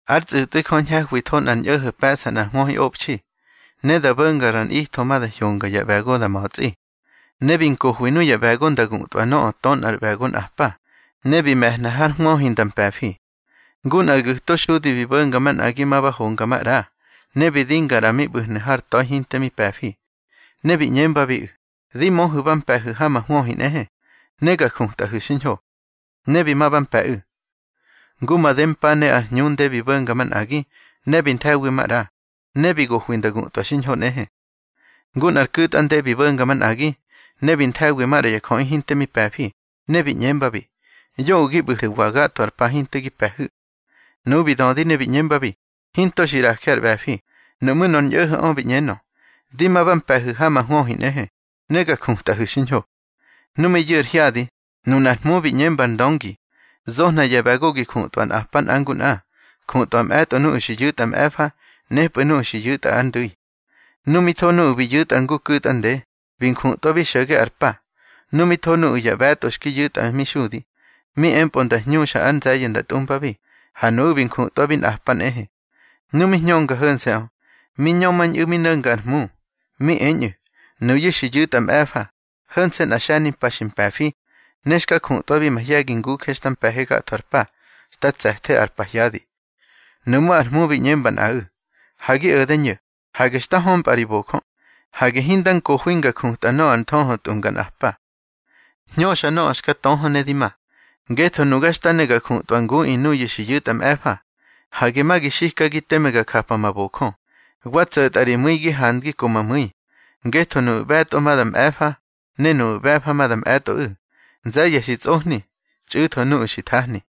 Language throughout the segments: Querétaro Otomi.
Ár tsꞌu̱tꞌwi Jö ñhe̱hwitho nꞌar ñꞌo̱ho̱ pe̱ꞌsa nꞌar hwöhiꞌobxi, ne da bo̱nga ra nꞌitho ma da hyonga ya ꞌbe̱go da ma̱tsꞌi. Ne bi nkohwi nuya ꞌbe̱go nda gutꞌwa nöꞌö tö nꞌar ꞌbe̱go nꞌa pa, ne bi me̱hna har hwöhi nda mpe̱fi. Ngu nꞌar gu̱to xudi bi bo̱nga manꞌagi ma ba honga maꞌra, ne bi dinga ꞌra mi ꞌbu̱hnu̱ har ta̱i hinte mi pe̱fi. Ne bi ꞌñembabiꞌu̱: Di möhu̱ ba mpe̱hu̱ ha ma hwöhi nꞌehe, ne ga jutꞌahu̱ xiñho. Ne bi ma ba mpe̱ꞌu̱. Ngu madempa ne ar hñunde bi bo̱nga manꞌagi, ne bi nthe̱wi maꞌra, ne bi gohwi nda gutꞌwa xiñho nꞌehe. Ngu nꞌar ku̱tꞌa nde bi bo̱nga manꞌagi, ne bi nthe̱wi maꞌra ya jöꞌi hinte mi pe̱fi, ne bi ꞌñembabi: Yoꞌö gi ꞌbu̱thu̱wa gatho ar pa hinte gi pe̱hu̱. Nuꞌu̱ bi dödi ne bi ꞌñembabi: Hinto xi ꞌraje ar ꞌbe̱fi. Nuꞌmú̱ nor ñꞌo̱ho̱ꞌö bi ꞌñenö: Di ma ba mpe̱hu̱ ha ma hwöhi nꞌehe, ne ga jutꞌahu̱ xiñho. Nu mi yu̱ ar hyadi, nunar hmu bi ꞌñemba ar ndöngi: Zohna ya ꞌbe̱go gi jutꞌwa nꞌapa nꞌa ngu nꞌa. Jutꞌwa mꞌe̱tꞌo nuꞌu̱ bi yu̱tꞌa mꞌe̱fa, nepꞌu̱ nuꞌu̱ bi yu̱tꞌa ar ndu̱i. Nu mi tho nuꞌu̱ bi yu̱tꞌa ngu ku̱tꞌa nde, bi njutꞌwabi xo̱ge ar pa. Nu mi tho nuꞌu̱ ya ꞌbe̱tꞌo xki yu̱tꞌa mi xudi, mi empꞌö nda hñuxa ár nze̱ye̱ nda tꞌumbabi, ha nuꞌu̱ bi njutꞌwabi nꞌapa nꞌehe. Nu mi hñönga ho̱nse̱ꞌö, mi ñömañꞌu̱ mi no̱nga ar hmu. Mi eñꞌu̱: Nuyu̱ xi yu̱tꞌa mꞌe̱fa, ho̱nse̱ nꞌa xe̱nimpa xi mpe̱fi, ne xka jutꞌwabi mahye̱gi nguje xta mpe̱he gatho ar pa, xta tse̱the ar pahyadi. Nuꞌmú̱ ar hmu bi ꞌñemba nꞌaꞌu̱: Ha gi o̱de ño̱, hage xta ko̱mpꞌa ri bojö. Hage hinda nkohwi nga jutꞌa nöꞌö ar nthöhö tꞌunga nꞌapa. Hñöxa nöꞌö xka töhö ne di ma, ngetho nuga xta ne ga jutꞌwa nguꞌi nuyu̱ xi yu̱tꞌa mꞌe̱fa. Hage ma gi xikagi teme ga japa ma bojö. Wa tso̱tꞌa ri mu̱i gi handgi ko ma mu̱i. Ngetho nuꞌu̱ ꞌbe̱tꞌo ma da mꞌe̱fa, ne nuꞌu̱ ꞌbe̱fa ma da mꞌe̱tꞌoꞌu̱. Nze̱ye̱ xi tsꞌohni, txꞌu̱tho nuꞌu̱ xi thahni.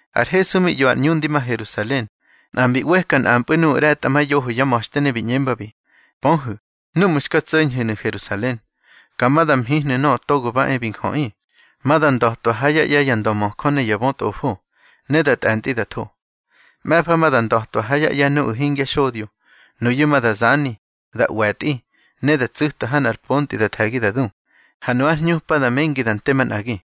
Ar Hesu mi ꞌyo ar ꞌñu ndi ma Herusalen, nꞌa mbi ꞌweka nꞌampꞌu̱ nuꞌu̱ ꞌre̱tꞌamayoho yá ma̱xte ne bi ꞌñembabi: —Pöhu̱, núꞌmu̱ xka tso̱ñhu̱nu̱ Herusalen, ka ma da mhihnu̱ Nöꞌö Togo ba e bi Njöꞌi. Ma da nda̱twa ha yá ꞌye̱ ya ndömöjö ne ya bötꞌofo, ne da tꞌe̱ntꞌi da tho. Mꞌe̱fa ma da nda̱twa ha yá ꞌye̱ nuꞌu̱ hingya xodyo. Nuyu̱ ma da zani, da ꞌwe̱tꞌi, ne da tsu̱ta ha nꞌar pontꞌi da the̱gi da du, ha nu ár hñupa da mengi da nte manꞌagi.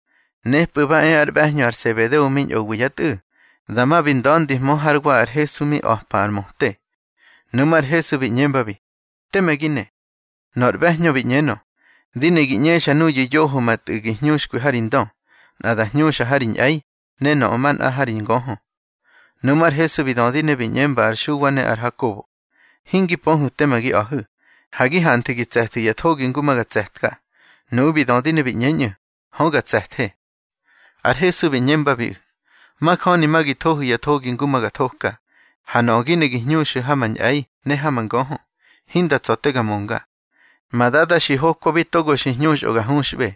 Nepꞌu̱ ba e ár ꞌbe̱hñö ar Sebedeo mi ñꞌowi yá tꞌu̱, dama bi nda̱ndihmö hár wa ar Hesu mi a̱pa ar möte. Nuꞌmú̱ ar Hesu bi ꞌñembabi: —Teme gi ne. Nor ꞌbe̱hñö bi ꞌñenö: —Di ne gi ꞌñexa nuyu̱ yoho ma tꞌu̱ gi hñuxkwi há ri ndö, nꞌa da hñuxa ha ri ñꞌe̱i, ne nöꞌö manꞌa ha ri ngöhö. Nuꞌmú̱ ar Hesu bi dödi ne bi ꞌñemba ar Xuwa ne ar Hakobo: —Hingi pöhu̱ teme gi a̱hu̱. Ha gi hanthu̱ gi tse̱thu̱ ya thogi ngu ma ga tse̱tka. Nuꞌu̱ bi dödi ne bi ꞌñeñꞌu̱: —Hö ga tse̱the. Ar Hesu bi ꞌñembabiꞌu̱: —Majöni ma gi thohu̱ ya thogi ngu ma ga thoka. Ha nöꞌö gi ne gi hñuxu̱ ha ma ñꞌe̱i ne ha ma ngöhö, hinda tsa̱ te ga mönga. Ma Dada xi hokwabi togo xi hñuxꞌö ga huxꞌbe.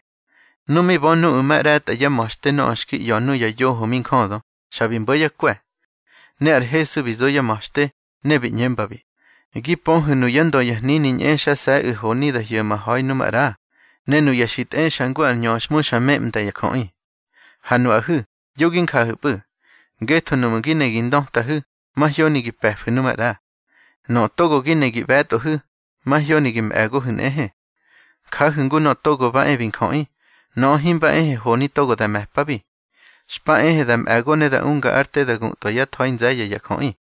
Nu mi bö nuꞌu̱ ma ꞌre̱tꞌa yá ma̱xte nöꞌö xki ꞌya̱ nuya yoho mi njödö, xa bi mbo̱ yá kwe̱. Ne ar Hesu bi zo yá ma̱xte, ne bi ꞌñembabi: —Gi pöhu̱ nuyá ndö ya hnini ñꞌexase̱ꞌu̱ honi da hyo̱ma ha̱i nu maꞌra, ne nuya xi tꞌexa ngu ar ñöxhmu xa meꞌmda ya jöꞌi. Ha nuꞌahu̱, yo gi njahu̱pꞌu̱, ngetho nuꞌmu̱ gi ne gi ndötahu̱, mahyoni gi pe̱fu̱ nu maꞌra. Nöꞌö togo gi ne gi ꞌbe̱tꞌohu̱, mahyoni gi mꞌe̱gohu̱ nꞌehe. Jahu̱ ngu Nöꞌö Togo ba e bi Njöꞌi. Nöꞌö himba ehe honi togo da me̱pabi. Xpa ehe da mꞌe̱go ne da unga ár te da gutꞌwa yá tha̱i nze̱ye̱ ya jöꞌi.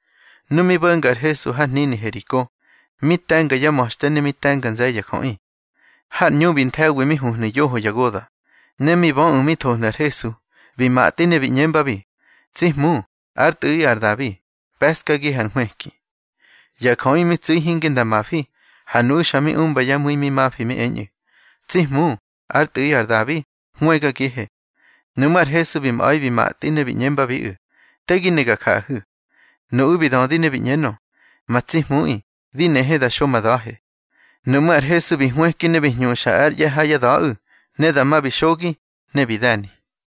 Nu mi bo̱nga ar Hesu har hnini Heriko, mi te̱nga yá ma̱xte ne mi te̱nga nze̱ye̱ ya jöꞌi. Har ꞌñu bi nthe̱wi mi huhnu̱ yoho ya goda̱, ne mi böꞌu̱ mi thohnu̱ ar Hesu, bi matꞌi ne bi ꞌñembabi: —Tsi Hmu, ár Tꞌu̱ꞌi ar Dabi, pe̱ꞌskagihe ar nhwëki. Ya jöꞌi mi tsu̱i hinge nda mafi, ha nuꞌu̱ xa mi umba yá mu̱i mi mafi mi eñꞌu̱: —Tsi Hmu, ár Tꞌu̱ꞌi ar Dabi, hwëgagihe. Nuꞌmú̱ ar Hesu bi mꞌa̱i bi matꞌi, ne bi ꞌñembabiꞌu̱: —Te gi ne ga jaꞌahu̱. Nuꞌu̱ bi dödi ne bi ꞌñenö: —Ma tsi Hmuꞌi, di nehe da xo ma da̱he. Nuꞌmú̱ ar Hesu bi hwëki ne bi hñuxa ár ꞌye̱ ha yá da̱ꞌu̱, ne dama bi xogi, ne bi de̱ni.